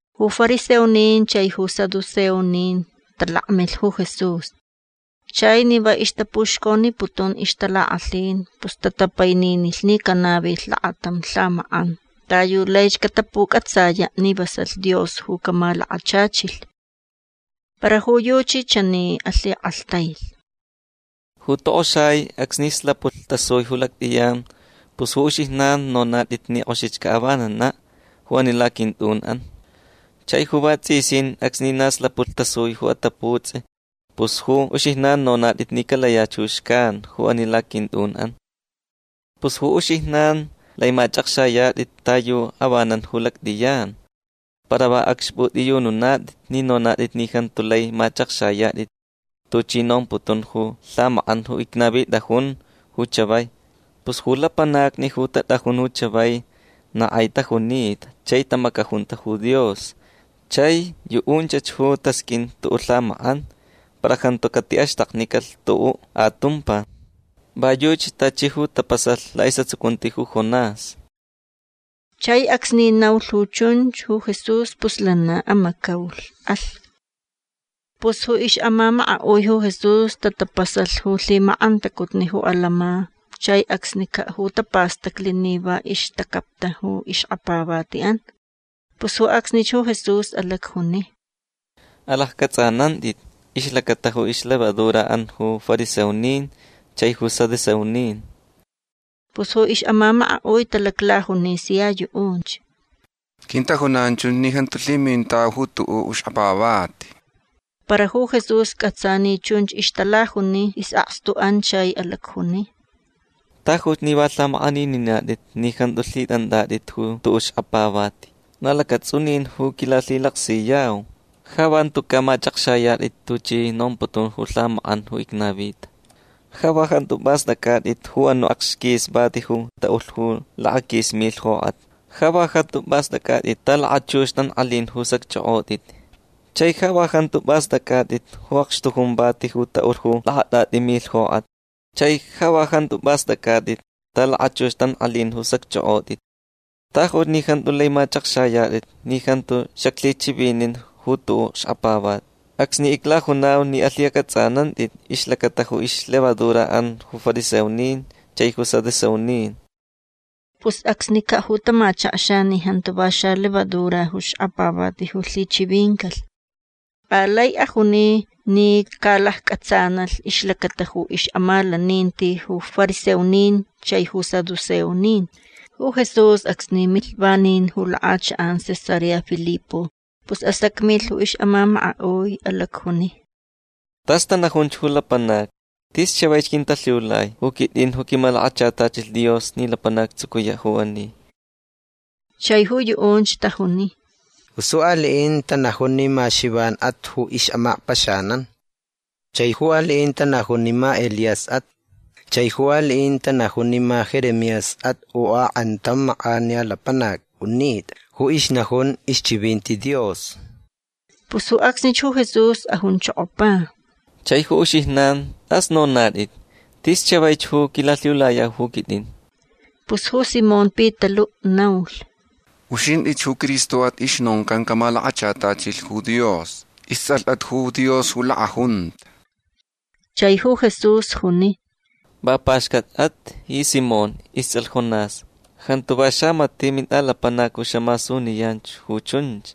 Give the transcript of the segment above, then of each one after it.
Ju fariseonin chai ju saduceonin talakmilh ju Jesús. Chai ni va ixtapuxconiputun ixtalakʼalhin pus tatapaininilh ni canavilh lakatam lhamakʼan ta yu laich catapucʼatsayaʼ ni vasalh Dios ju camalakachachilh. Para ju yuchi chani alhikʼalhtailh: ―Ju tokʼoxai acsni slapulh tasui ju lactʼiyan pus ju uxijnan nonatʼit ni kʼoxich caʼavananaʼ ju ani laquintʼunʼan. Chai ju vatsʼisin acsni na slapulh tasui ju ataputsʼi pus ju uxijnan nonatʼit ni calayach ju xcan ju ani laquintʼunʼan. Pus ju uxijnan lai machʼakxayatʼit ta yu avanan ju lactʼiyan. Para va acxpʼutʼiyununatʼit ni nonatʼit ni jantu lai machʼakxayatʼit tuchi nomputun ju lhamakʼan ju icnavitʼajun ju chavai. Pus ju lapanacni ju tatʼajun ju chavai na kʼai tajunita chai tamacajunta ju Dios. Chai yuʼunchach ju tasqʼuin tuʼuʼ lhamakʼan. Para jantu catiʼaxtaknicalh tuʼuʼ atumpa. Va yuchi tachi ju tapasalh laʼisʼatsucunti ju Jonás. Chai acsni naulh ju chunch ju Jesús pus lana amacaulh. Alh. Pus ju ixʼamamakaʼui ju Jesús tatapasalh ju lhimakʼantacutni ju atantsʼin chai acsnicaʼ ju tapastacli ni va ixtacapta ju ixkapavatiʼan. Pus ju acsnich ju Jesús alacjuni: ―Alaccʼatsʼanantʼit ixlacata ju ixlevaduraʼan ju fariseonin chai ju saduceonin. Pus ju ixʼamamakaʼui talaclajuni sia yuʼunch: ―Quintajunan chunch ni jantu lhimintau ju tuʼuʼ xkapavati. Para ju Jesús cʼatsa ni chunch ixtalajuni isʼakstuʼan chai alacjuni: ―Tajuch ni va lhamakʼanininatʼit ni jantu lhitʼantʼatʼit ju tuʼuʼ xkapavati. Na lacatsʼunin ju quilalhilaksiyau. Ja va jantucaʼ machʼakxayatʼit tuchi nomputun ju lhamakʼan ju icnavita. Ja va jantu pʼastʼactʼit ju anuʼ akxquis vati ju taʼulh ju lakaquis milh jokʼatni. Ja va jantu pʼastʼactʼit ta lakachux tankʼalin ju sacchʼokʼotʼit. Chai ja va jantu pʼastʼactʼit ju akxtujun vati ju taʼulh ju lakatʼatʼi milh jokʼatni. Chai ja va jantu pʼastʼactʼit ta lakachux tankʼalin ju sacchʼokʼotʼit. Tajuch ni jantu lai machʼakxayatʼit ni jantu xaclhichivinin ju tuʼuʼ xkapavati acsni iclajunau ni alhicʼatsʼanantʼit ixlacata ju ixlevaduraʼan ju fariseonin chai ju saduceonin. Pus acsnicaʼ ju tamachakxa ni jantu va xalevadura ju xkapavati ju lhichivincalh. Alai ajuni ni calaccʼatsanalh ixlacata ju ixʼamalaninti ju fariseonin chai ju saduceonin. Ju Jesús acsni milh vanin ju lakʼachakʼan Cesarea Filipo pus asacmilh ju ixʼamamakaʼui. Alacjuni: ―Tas tanajun ju lapanacni. Tis chavaich quintalhiulai ju quitʼin ju quimalakachatachilh Dios ni lapanac actsucuyaʼ ju ani. Chai ju yuʼunch tajuni: ―Pus ju aliʼin tanajun ni ma Xivanʼat ju ixʼamakpaxanan. Chai ju aliʼin tanajun ni ma Elíasʼat. Chai ju aliʼin tanajun ni ma Jeremíasʼat u akʼantam makʼaniya lapanac unitʼa ju ixnajun ixchivinti Dios. Pus ju acsnich ju Jesús ajunchokopa: ―Chai ju uxijnan tʼas nonatʼit. Tis chavaich ju quilalhiulayau ju quitʼin. Pus ju Simón Pitaluʼ naulh: ―Uxintʼich ju Cristoʼat ju ixnoncan camalakachatachilh ju Dios. Istsʼalhʼat ju Dios ju lakʼajunta. Chai ju Jesús juni: ―Va paxcatchʼat ji Simón istsʼalh Jonás. Jantu va xamatiʼ mintʼalapanac ju xamasuniyan ju chunch.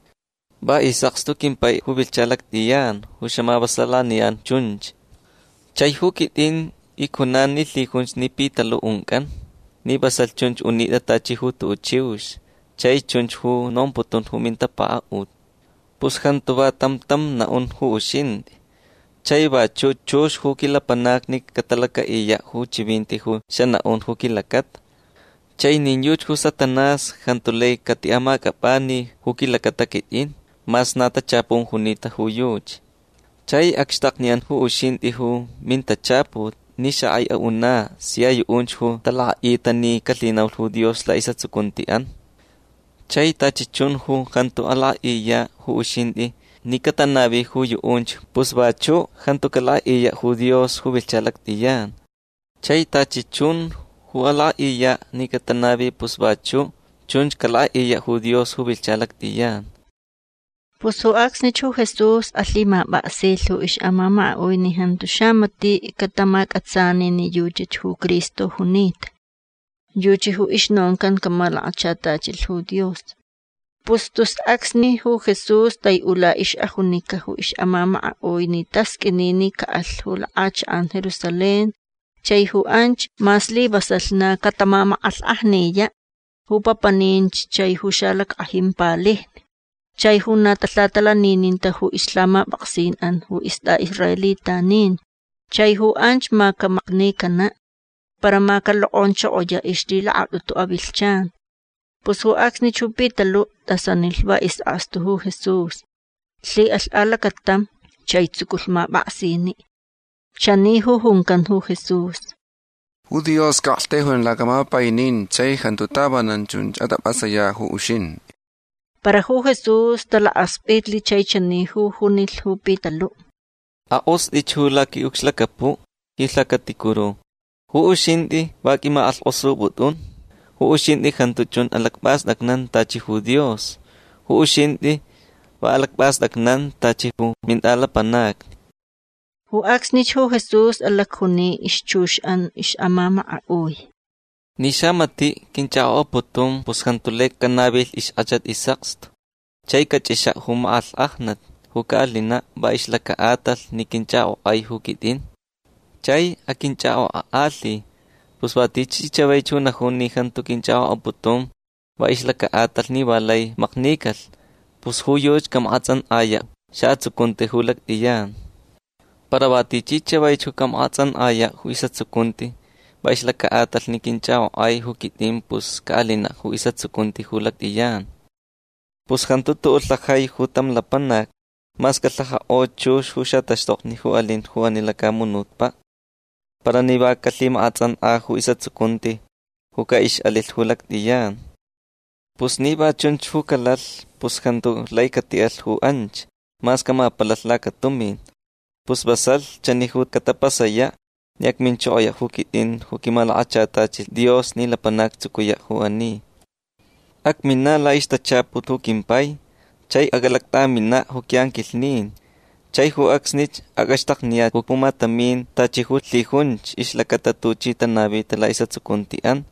Va isʼakstu quimpai ju vilhcha lactʼiyan ju xamavasalaniyan chunch. Chai ju quitʼin icjunan ni lhijunch ni Pitaluʼ uncʼan ni vasalh chunch unitʼa tachi ju tuʼuʼ chiux chai chunch ju nomputun ju mintapakaʼut. Pus jantu va tam tam naʼun ju uxintʼi. Chai vachuʼ chux ju quilapanacni catalacaʼiyaʼ ju chivinti ju xanaʼun ju quilacata. Chai nin yuchi ju Satanás jantu lai catiʼamacʼapʼani ju quilacata quitʼin mas na tachapun junita ju yuchi. Chai acxtakniyan ju uxintʼi ju mintachaput ni xakʼai aʼunaʼ sia yuʼunch ju talakʼaʼita ni calhinaulh ju Dios laʼisʼatsucuntiʼan. Chai tachi chun ju jantu alakʼaʼiyaʼ ju uxintʼi ni catanavi ju yuʼunch pus vachuʼ jantu calakʼaʼiyaʼ ju Dios ju vilhcha lactʼiyan. Chai tachi chun ju alakʼaʼiyaʼ ni catanavi pus vachuʼ chunch calakʼaʼiyaʼ ju Dios ju vilhcha lactʼiyan. Pus ju acsnich ju Jesús alhimapʼaksilh ju ixʼamamakaʼui ni jantu xamatiʼ catamacʼatsani ni yuchach ju Cristo junita. Yuchi ju ixnoncan camalakachatachilh ju Dios. Pus tus acsni ju Jesús taiʼula ixʼajunica ju ixʼamamakaʼui ni tasqʼuini ni caʼalh ju lakʼachakʼan Jerusalén. Chai ju anch ma slivasalh na catamamakʼalhkʼajniyaʼ ju papaninch chai ju xalackʼajin palijni chai ju na talhatalanininta ju ixlhamapʼaksinʼan ju istʼaʼisraelitanin. Chai ju anch ma camaknicanaʼ. Para ma calokʼonchokoyaʼ ixlhilakatʼutu avilhchan. Pus ju acsnich ju Pitaluʼ tʼasanilh va isʼakstu ju Jesús. Lhiʼalh alacatam chai tsuculh mapʼaksiniʼ. Chani ju juncan ju Jesús: ―Ju Dios caʼaktaijuyan lacaʼamapaininti chai jantu tavanan chunch atʼapʼasayaʼ ju uxintʼi. Para ju Jesús talakaspʼitlh chai chani ju junilh ju Pitaluʼ: ―Akʼostʼich ju laquiʼucxlacapuʼ ji lhacaticuru. Ju uxintʼi va quimakʼalhkʼosupʼutʼun. Ju uxintʼi jantu chun alacpʼastʼacnan tachi ju Dios. Ju uxintʼi va alacpʼastʼacnan tachi ju mintʼalapanacni. Ju acsnich ju Jesús alacjuni ixchuxʼan ixʼamamakaʼui: ―Ni xamatiʼ quinchʼakʼokʼaputun pus jantu lai canavilh ixkʼachat isʼakstu. Chai cachʼixaʼ ju makʼalhkʼajnat ju caʼalinaʼ va ixlacaʼatalh ni quinchʼakʼokʼai ju quitʼin. Chai aquinchʼakʼokʼakʼalhi. Pus va tichi chavaich ju najun ni jantu quinchʼakʼokʼaputun va ixlacaʼatalh ni va lai maknicalh pus ju yuchi camakʼatsʼankʼayaʼ ju xaʼatsucunti ju lactʼiyan. Para va tichi chavaich ju camakʼatsʼankʼayaʼ ju isʼatsucunti va ixlacaʼatalh ni quinchʼakʼokʼai ju quitʼin pus caʼalinaʼ ju isʼatsucunti ju lactʼiyan. Pus jantu tuʼuʼ lhajai tam lapanac mas calhajakʼo chux ju xataxtokni ju alin ju ani lacamunutpaʼ para ni va calhimakʼatsʼankʼa ju isʼatsucunti ju caʼixʼalilh ju lactʼiyan. Pus ni va chunch ju calalh pus jantu lai catiʼalh ju anch mas camapalalh lacatumin. Pus vasalh chani ju catapasayaʼ ni acminchokoyaʼ ju quitʼin ju quimalakachatachilh Dios ni lapanac actsucuyaʼ ju ani. Acminaʼ laʼixtachaput ju quimpai. Chai acʼalactʼaminaʼ ju quiʼanquilhnin. Chai ju acsnich acʼaxtakniyaʼ ju pumatamin tachi ju lhijunch ixlacata tuchi tanavita laʼisʼatsucuntiʼan.